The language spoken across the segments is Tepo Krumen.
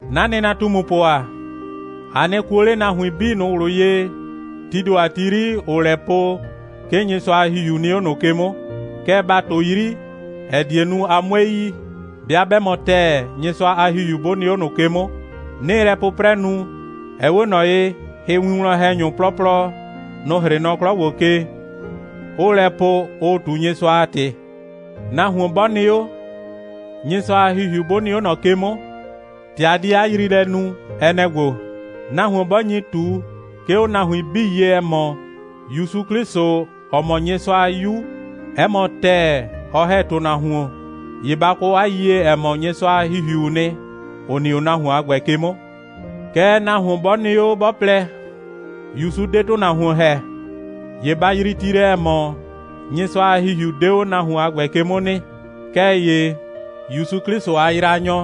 'Na nɩnatumupʋ ‑a, a nɩ kuo 'le nahuin 'bii ꞊nʋ ꞊wlʋ ye, tii ‑do a ti 'yri, ‑ʋʋ lɛ po, 'ke Nyɩsʋa a ‑Hihiu nɩ 'o ꞊nʋ ke 'mʋ. Kɛɛ, ba ꞊tʋ 'yri, ‑ɛ die nu, a 'mue yi, 'bɩa 'bɛ mɔ ‑tɛɛ, Nyɩsʋa a ‑Hihiu 'bʋ nɩ 'o ꞊nʋ ke 'mʋ. 'Nɩɩ lɛ 'pʋprɛ nu, ɛ 'we ꞊nɔ ye, hɩwinwlɔn‑hɛnyʋ 'plɔplɔ, nʋ‑ 'hrɩɩ nɔ 'klɔ ‑gbo ke, 'ʋʋ lɛ po, ʋʋ ꞊tu Nyɩsʋa a ‑tɩ. Nahuon 'bɔ nɩ 'o, Nyɩsʋa a ‑Hihiu 'bʋ nɩ 'o ꞊nɔ ke 'mʋ, ‑tɛ a di 'a yriilɛ nu, ɛ nɛ‑ ‑gbo: Nahuon 'bɔ nyi ꞊tu, 'ke 'o nahuin 'bii ye, ‑ɛ mɔ, ‑Yusu 'Klɩsʋ, ‑ɔ mɔ Nyɩsʋa a 'Yu, 'ɛ mɔ ‑tɛɛ, ɔ ‑hɛ ‑tʋnahuon, ‑ye ba kɔ 'a yiyie, ‑ɛ mɔ, Nyɩsʋa a ‑Hihiuu nɩ, ‑ʋ nɩ 'o nahuon a ‑gbɛ ke 'mʋ. Kɛɛ nahuon 'bɔ nɩ 'o, 'bɔ plɛ: ‑Yusu 'de ‑tʋnahuon ‑hɛ, ‑ye ba yrii ti lɛ, ‑ɛ mɔ, Nyɩsʋa a ‑Hihiu 'de 'o nahuon a ‑gbɛ ke 'mʋ nɩ. Kɛɛ ‑ye ‑Yusu 'Klɩsʋ a yraanyɔ,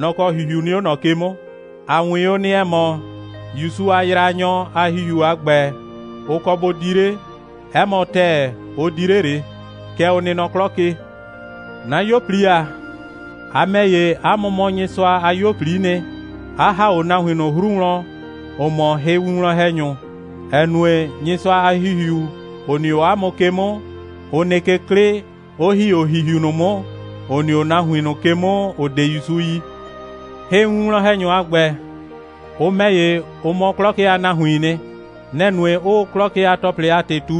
nɔ‑ kɔ ‑hihiu nɩ 'o ꞊nɔ ke 'mʋ. A 'wɩn o nɩ, ‑ɛ mɔ, ‑Yusu a yraanyɔ a ‑hihiu a ‑gbɛ, ʋ kɔ bʋ di 'le. 'Ɛ mɔ ‑tɛɛ, ʋ di 'le ꞊le. Kɛ ʋ nɩ nɔ 'klɔ ke. 'Na 'yuo꞊pli ‑a, a ‑mɛ ‑ye, 'a mʋ mɔ Nyɩsʋa a 'yuo꞊pli'i nɩ, 'a ‑ha 'o nahuin ꞊nʋ 'hru wlɔn, ‑ʋ mɔ hɩwinwlɔn‑hɛnyʋ, ‑ɛ nue, Nyɩsʋa a ‑Hihiu, ‑ʋ nɩ 'o 'a mʋ ke 'mʋ, ʋ nɩ ke 'klɩ, 'ʋ ‑hi 'o ‑hihiu ꞊nʋ 'mʋ, ‑ʋ nɩ 'o nahuin ꞊nʋ ke 'mʋ, ‑ʋ 'de ‑Yusu yi. Hɩwinwlɔn‑hɛnyʋ a ‑gbɛ, ʋ ‑mɛ ‑ye, ʋ mɔ 'klɔ ke a nahuiin nɩ. Nɛ‑ nue, 'ʋʋ 'klɔ ke a ‑tɔplɩ a ‑tɩ ꞊tu,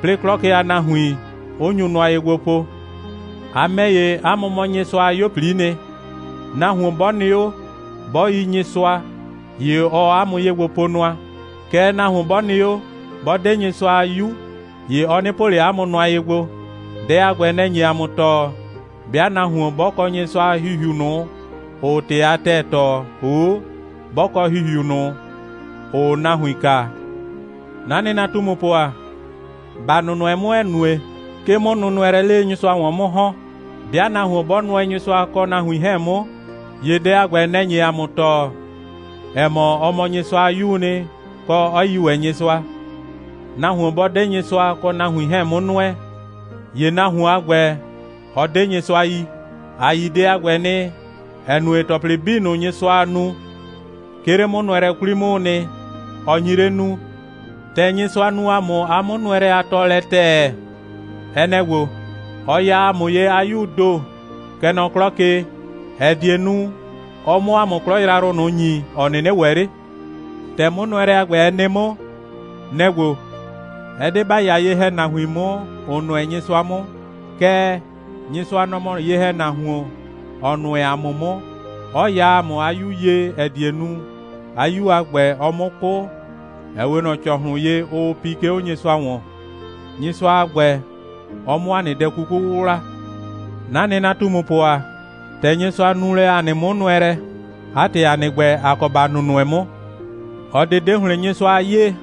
'plɩɩ 'klɔ ke a nahuin 'ʋ nyu nʋa ye gbo po. ‑A ‑mɛ ‑ye, ‑a mʋ mɔ Nyɩsʋa a 'yuo꞊pli'i nɩ. Nahuon 'bɔ nɩ 'o, 'bɔ yi Nyɩsʋa, ‑ye ɔɔ ‑a mʋ ye gbo po nʋa. Kɛɛ, nahuon 'bɔ nɩ 'o, 'bɔ 'de Nyɩsʋa a 'yu, ‑ye ɔ 'nɩ po ꞊le ‑a mʋ nʋa ye gbo. Dɛ a ‑gbɛ, nɛ‑ nye ‑a mʋ tɔɔ, 'bɩa nahuon 'bɔ kɔ Nyɩsʋa a ‑Hihiu ꞊nʋ, ‑ʋʋ ‑tɩ a ‑tɛɛ tɔɔ, ‑hoo' 'bɔ kɔ ‑hihiu ꞊nʋ, ‑ʋʋ nahuin kaa. 'Na nɩnatumupʋ ‑a, ‑ba nʋnʋɛ 'mʋ, ‑ɛ nue, 'ke 'mʋnʋnʋɛlɛɛ 'le Nyɩsʋa ‑wɔn 'mʋ ‑hɔn. 'Bɩa nahuon 'bɔ nʋɛ Nyɩsʋa kɔ nahuin 'hɛɛn 'mʋ, ‑ye dɛ a ‑gbɛ, nɛ‑ nye ‑a mʋ tɔɔ, ‑ɛ mɔ, ɔ mɔ Nyɩsʋa a 'yuu nɩ, kɔ, 'ɔ yi ‑wɛ Nyɩsʋa. Nahuon 'bɔ 'de Nyɩsʋa kɔ nahuin 'hɛɛn 'mʋ nʋɛ, ‑ye nahuon a ‑gbɛ, ɔ 'de Nyɩsʋa yi. ‑A yi dɛ a ‑gbɛ nɩ, ‑ɛ nue, ‑tɔplɩ 'bii ꞊nʋ, Nyɩsʋaa nu, 'ke 'le 'mʋnʋɛlɛ 'kwli 'mʋʋ nɩ, ɔ nyi 'le nuu. ‑Tɛ Nyɩsʋa nu ‑a mʋ 'a 'mʋnʋɛlɛ a tɔɔlɛ ‑tɛɛ, ɛ nɛ‑ ‑gbo: Ɔ ya ‑a mʋ ye 'a 'Yuu ‑do, kɛ nɔ 'klɔ ke, ‑ɛ die nu, ɔ 'mʋ ‑a mʋ 'klɔ yrayrʋ ꞊nʋ ‑nyi, ‑ɔ 'nɩnɩ ‑wɛ 'le. ‑Tɛ 'mʋnʋɛlɛ a ‑gbɛ, ɛ nɩ 'mʋ, nɛ‑ ‑gbo: Ɛ 'de ‑ba 'ya ye‑hɛnahuin 'mʋ, ‑ʋ nʋɛ Nyɩsʋa 'mʋ, kɛɛ, Nyɩsʋa, nɔ‑ mɔ ye‑hɛnahuon, ‑ɔ nʋɛ ‑a mʋ 'mʋ, 'ɔ ya ‑a mʋ 'a 'Yu ye, ‑ɛ die nu, 'a 'Yu a ‑gbɛ, ɔ 'mʋ 'kʋ, ‑ɛ 'we ꞊nɔ ‑cɔhlʋn ye, ʋʋ pi, 'ke 'o Nyɩsʋa ‑wɔn, Nyɩsʋa a ‑gbɛ, ɔ 'mʋ ‑a nɩ dɛ 'kuku 'wʋwla. 'Na nɩnatumupʋ ‑a, ‑tɛ Nyɩsʋa nu lɛ ‑a nɩ 'mʋnʋɛlɛ, 'a ‑tɩ, ‑a nɩ ‑gbɛ, ‑a kɔ ‑ba nʋnʋɛ 'mʋ. ꞊Ɔ ꞊de 'de ‑hlɩn Nyɩsʋa a 'yee,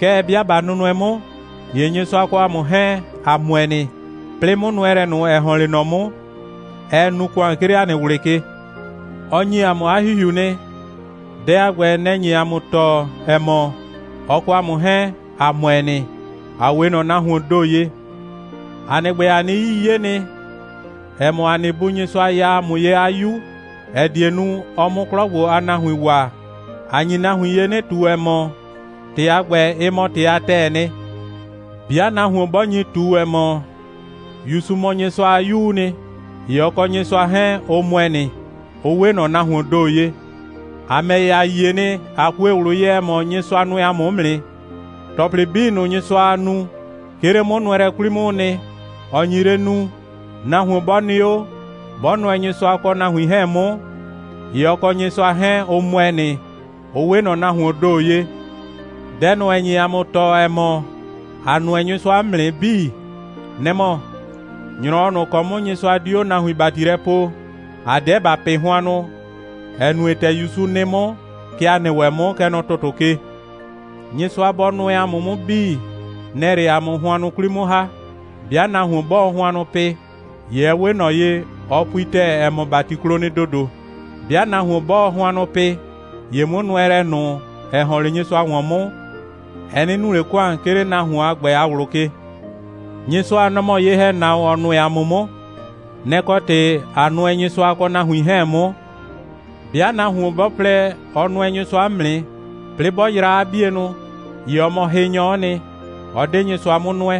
kɛɛ, 'bɩa ꞊ba nʋnʋɛ 'mʋ, ‑ye Nyɩsʋa kɔ ‑a mʋ 'hɛɛn, ‑a ‑mʋɛ nɩ, 'plɩɩ 'mʋnʋɛlɛ ꞊nʋ, ‑ɛ ‑hɔn 'le ꞊nɔ 'mʋ, ɛɛ nu ‑kʋan, 'ke 'le ‑a nɩ ꞊wlɩ ke. Ɔ ‑nyi ‑a mʋ 'a ‑Hihiu nɩ. Dɛ a ‑gbɛ, nɛ‑ nye ‑a mʋ tɔɔ, ‑ɛ mɔ, ɔ kɔ ‑a mʋ 'hɛɛn, ‑a ‑mʋɛ nɩ, ‑a 'we ꞊nɔ nahuoon ‑do ye. ‑A nɩ ‑gbɛ, ‑a nɩ 'yii 'ye nɩ, ‑ɛ mɔ, ‑a nɩ Bu Nyɩsʋa ya ‑a mʋ ye 'a 'Yu, ‑ɛ die nu, ɔ 'mʋ 'klɔ ‑gbo a nahuin waa. ‑A nyi nahuin ye 'nɩ ꞊tu, ‑ɛ mɔ, ‑tɩ a ‑gbɛ, ɩ mɔ ‑tɩ a ‑tɛɛ nɩ. 'Bɩa nahuon 'bɔ nyi ꞊tu, ‑ɛ mɔ, ‑Yusu mɔ Nyɩsʋa a 'Yuu nɩ, ‑ye ɔ kɔ Nyɩsʋa 'hɛɛn, ʋ ‑mʋɛ nɩ, ʋ 'we ꞊nɔ nahuoon ‑do ye. ‑A ‑mɛ ‑ye, ‑a yie nɩ, ꞊a kue ꞊wlʋ ye, ‑ɛ mɔ, Nyɩsʋa nʋɛ ‑a mʋ 'mʋ nɩ. ‑Tɔplɩ 'bii ꞊nʋ, Nyɩsʋaa nu, 'ke 'le 'mʋnʋɛlɛ 'kwli 'mʋʋ nɩ, ɔ nyi 'le nuu. Nahuon 'bɔ nɩ 'o, 'bɔ nʋɛ Nyɩsʋa kɔ nahuin 'hɛɛn 'mʋ, ‑ye ɔ kɔ Nyɩsʋa 'hɛɛn, ʋ ‑mʋɛ nɩ, ʋ 'we ꞊nɔ nahuoon ‑do ye. Dɛ ꞊nʋ, ‑ɛ nye ‑a mʋ tɔɔ, ‑ɛ mɔ, ‑a nʋɛ Nyɩsʋa 'mʋ nɩ 'bii, nɛ‑ mɔ: ‑Nyrɔwɔ ꞊nʋ ‑kɔ 'mʋ Nyɩsʋa di 'o nahuin ‑bati lɛ poo, ‑a 'deɛ ‑ba pɩ hʋannʋ, ‑ɛ nue, ‑tɛ ‑Yusu nɩ 'mʋ, kɛ ‑a nɩ ‑wɛ 'mʋ, kɛ nɔ ‑tʋtʋ ke. Nyɩsʋa bɔ nʋɛ ‑a mʋ 'mʋ 'bii, nɛ‑ɛ 'le ‑a mʋ hʋannʋ 'kwli 'mʋ ‑ha. 'Bɩa nahuon 'bɔɔ hʋannʋ pɩ, ‑ye ɛ 'we ꞊nɔ ye, ɔ pui ‑tɛɛ, ‑ɛ mɔ, ‑bati klo nɩ ‑dodo. 'Bɩa nahuon 'bɔɔ hʋannʋ pɩ, ‑ye 'mʋnʋɛlɛ ꞊nʋ, ‑ɛ ‑hɔn 'le Nyɩsʋa ‑wɔn 'mʋ, ɛ 'nɩ nu ꞊le ‑kʋan, 'ke 'le nahuon a ‑gbɛ a ꞊wlʋ ke. Nyɩsʋa, nɔ‑ mɔ ye‑hɛnahuon, ‑ɔ nʋɛ ‑a mʋ 'mʋ. Nɛ‑ kɔ ‑tɩ, ꞊a nʋɛ Nyɩsʋa kɔ nahuin 'hɛɛn 'mʋ. 'Bɩa nahuon 'bɔ plɛ, ɔ nʋɛ Nyɩsʋa 'mʋ nɩ, 'plɩɩ 'bɔ yraa 'a 'bienʋ, ‑ye ɔ mɔ hɩnyɔ'ɔ nɩ, ɔ 'de Nyɩsʋa 'mʋ nʋɛ.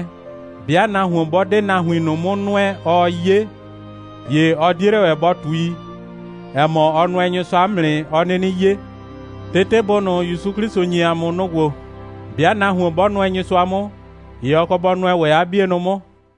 'Bɩa nahuon 'bɔ 'de nahuin ꞊nʋ 'mʋ nʋɛ, ɔɔ 'ye, ‑ye ɔ 'die 'le ‑wɛ bɔ ꞊tui, ‑ɛ mɔ, ɔ nʋɛ Nyɩsʋa 'mʋ nɩ, ɔ 'nɩnɩ 'ye. Tetebʋ ꞊nʋ, ‑Yusu 'Klɩsʋ ‑nyi ‑a mʋ, nʋ‑ ‑gbo: 'Bɩa nahuon 'bɔ nʋɛ Nyɩsʋa 'mʋ, ‑ye ɔ kɔ bɔ nʋɛ ‑wɛ 'a 'bienʋ 'mʋ.